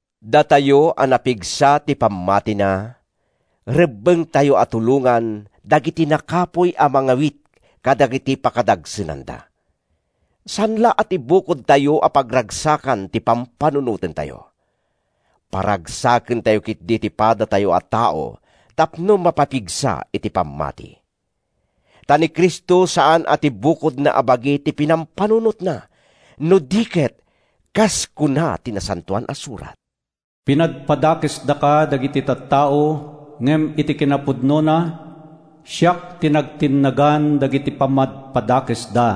Datayo a napigsa ti pammatina, rebbengtayo a tulongan dagiti nakapuy a mangawit kadagiti pakadagsenanda. Saan la a ti bukodtayo a pagragsakan ti pampanunotentayo. Paragsakentayo ketdi ti padatayo a tao tapno mapapigsa iti pammati. Ta ni Cristo saan a ti bukodna a bagi ti pinampanunotna, no di ket, kas kuna ti Nasantoan a Surat, “Pinadpadakesdaka dagiti tattao ngem iti kinapudnona, siak ti nagtinnagan dagiti pammadpadakesda.”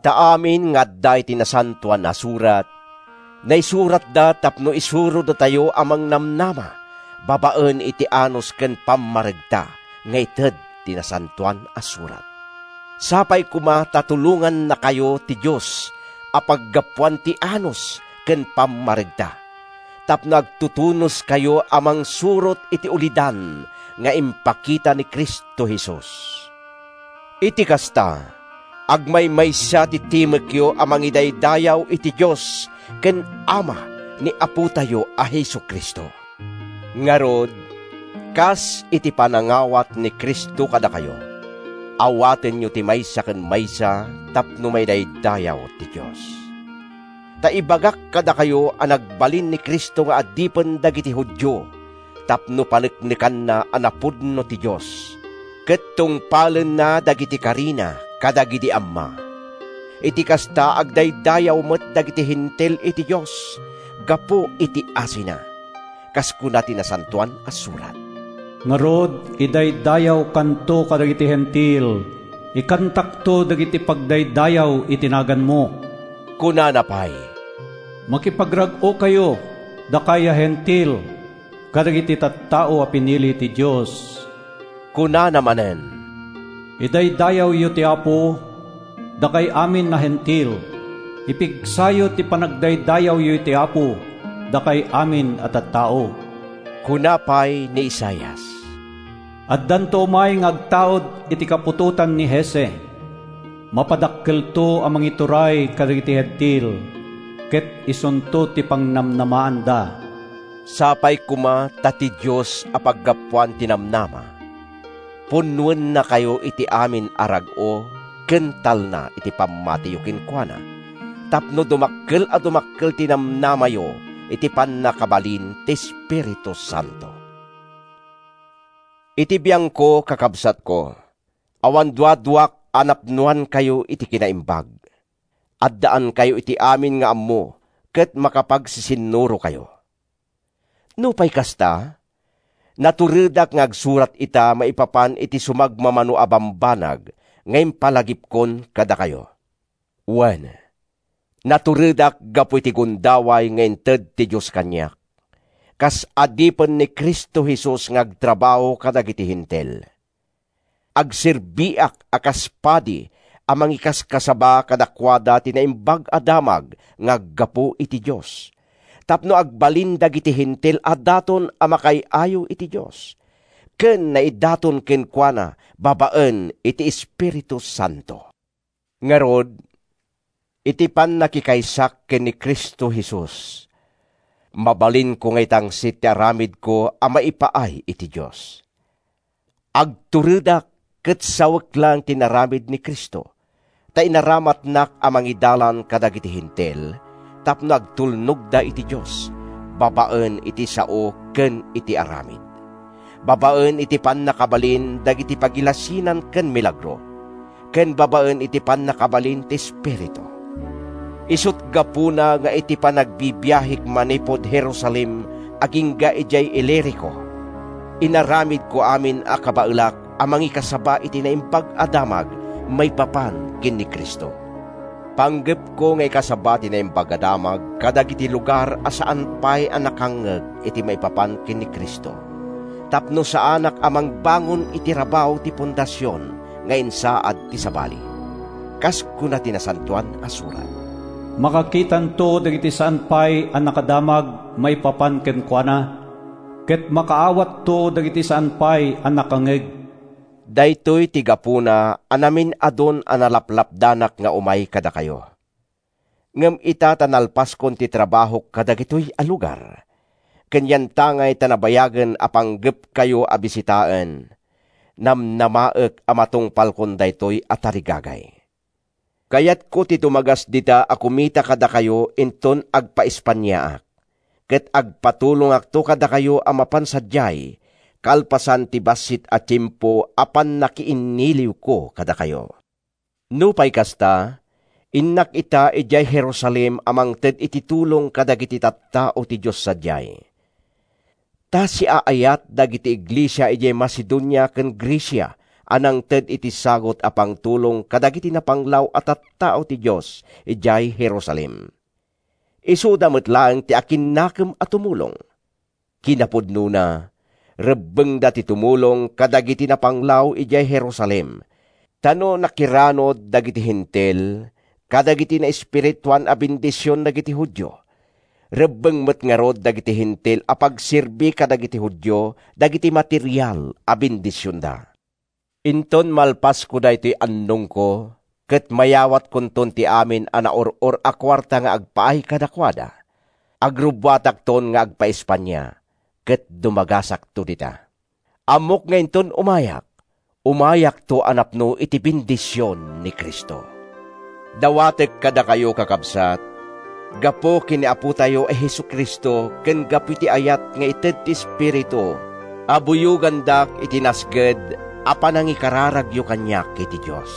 Ta amin nga adda iti Nasantoan a Surat, naisuratda tapno isurodatayo a mangnamnama babaen iti anus ken pammaregta nga ited ti Nasantoan a Surat. Sapay koma ta tulongannakayo ti Dios a paggapuan ti anus ken pammaregta, tapno agtutunoskayo a mangsurot iti ulidan nga impakita ni Cristo Jesus. Iti kasta, agmaymaysa ti timekyo a mangidaydayaw iti Dios ken Ama ni Apotayo a Jesu-Cristo. Ngarud, kas iti panangawat ni Cristo kadakayo, awatenyo ti maysa ken maysa tapno maidaydayaw ti Dios. Ta ibagak kadakayo a nagbalin ni Cristo nga adipen dagiti Judio tapno paneknekanna a napudno ti Dios, ket tungpalenna dagiti karina kadagidi amma. Iti kasta, agdaydayaw met dagiti Hentil iti Dios gapu iti asina. Kas kuna ti Nasantoan a Surat, “Ngarud, idaydayawkanto kadagiti Hentil; Ikantakto dagiti pagdaydayaw iti naganmo.” Kunana pay, “Makipagrag-okayo, dakay a Hentil, kadagiti tattao a pinili ti Dios!” Kunana manen, “Idaydayawyo ti Apo, dakay amin a Hentil; Ipigsayo ti panagdaydayawyo iti Apo, dakay amin a tattao!” Kuna pay ni Isaias, “Addanto umay nga agtaud iti kaputotan ni Jesse; Mapadakkelto a mangituray kadagiti Hentil, Ket isunto ti pangnamnamaanda.” Sapay koma ta ti Dios a paggapuan ti namnama, punnoennakayo iti amin a rag-o ken talna iti pammatiyo kenkuana tapno dumakkel a dumakkel ti namnamayo iti pannakabalin ti Espiritu Santo. Iti biangko, kakabsatko, awan duaduak a napnoankayo iti kinaimbag, addaankayo iti amin nga ammo ket makapagsisinnurokayo. Nupay kasta, naturedak nga agsurat ita maipapan iti sumagmamano a bambanag nga impalagipkon kadakayo. Wen, naturedak gapu iti gundaway nga inted ti Dios kaniak, kas adipen ni Cristo Jesus nga agtrabaho kadagiti Hentil. Agserbiak a kas padi a mangikaskasaba kadakuada ti Naimbag a Damag nga aggapu iti Dios, tapno agbalin dagiti Hentil a daton a makaay-ayo iti Dios, ken naidaton kenkuana babaen iti Espiritu Santo. Ngarud, iti pannakikaysak ken ni Cristo Jesus, mabalinko nga itangsit ti aramidko a maipaay iti Dios. Agturedak ket sawek laeng ti inaramid ni Cristo, ta inaramatnak a mangidalan kadagiti Hentil tapno agtulnogda iti Dios, babaen iti sao ken iti aramid, babaen iti pannakabalin dagiti pagilasinan ken milagro, ken babaen iti pannakabalin ti Espiritu. Isut’ gapuna nga iti panagbibiahek manipud Jerusalem agingga idiay Ilirico, inaramidko amin a kabaelak a nangikasaba iti Naimbag a Damag maipapan ken ni Cristo. Panggepko nga ikasaba ti Naimbag a Damag kadagiti lugar a saan pay a nakangngeg iti maipapan ken ni Cristo, tapno saanak a mangbangon iti rabaw ti fondasion nga insaad ti sabali. Kas kuna ti Nasantoan a Surat, “Makakitanto dagiti saan pay a nakadamag maipapan kenkuana, Ket makaawatto dagiti saan pay a nakangngeg.” Daytoy ti gapuna a naminadun a nalapdanak nga umay kadakayo. Ngem ita ta nalpaskon ti trabahok kadagitoy a lugar, ken yantangay ta nabayagen a panggepkayo a bisitaen, namnamaek a matungpalkon daytoy a tarigagay. Kayatko ti dumagas dita a kumita kadakayo inton agpa-Espaniaak ket agpatulongakto kadakayo a mapan sadiay kalpasan ti bassit a tiempo a pannakiinniliwko kadakayo. Nupay kasta, innak ita idiay Jerusalem a mangted iti tulong kadagiti tattao ti Dios sadiay. Ta siaayat dagiti iglesia idiay Macedonia ken Grecia a nangted iti sagut a pangtulong kadagiti napanglaw a tattao ti Dios idiay Jerusalem. Isuda met laeng ti akinnakem a tumulong. Kinapudnona, rebbengda ti tumulong kadagiti napanglaw idiay Jerusalem, ta no nakiranud dagiti Hentil kadagiti naespirituan a bendision dagiti Judio, rebbeng met ngarud dagiti Hentil a pagserbi kadagiti Judio dagiti material a bendisionda. Inton malpasko daytoy annongko ket mayawatkonton ti amin a naur-or a kuarta nga agpaay kadakuada, agrubbuatakton nga agpa-Espania ket dumagasakto dita. Ammok nga inton umayak, umayakto a napno iti bendision ni Cristo. Dawatek kadakayo, kakabsat, gapu ken ni Apotayo a Jesu-Cristo ken gapu iti ayat nga ited ti Espiritu a buyogandak iti nasged a panangikararagyo kaniak iti Dios.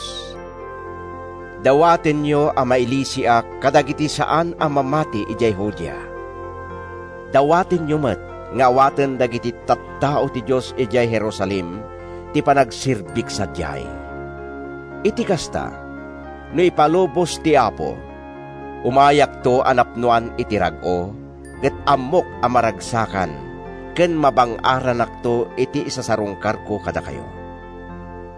Dawatenyo a mailisiak kadagiti saan a mamati idiay Judea. Dawatenyo met nga awaten dagiti tattao ti Dios idiay Jerusalem ti panagserbik sadiay. Iti kasta, no ipalubos ti Apo, umayakto a napnoan iti rag-o, ket ammok a maragsakan ken mabang-aranakto iti isasarungkarko kadakayo.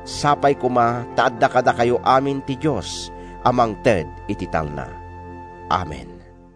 Sapay koma ta adda kadakayo amin ti Dios a mangted iti talna. Amen.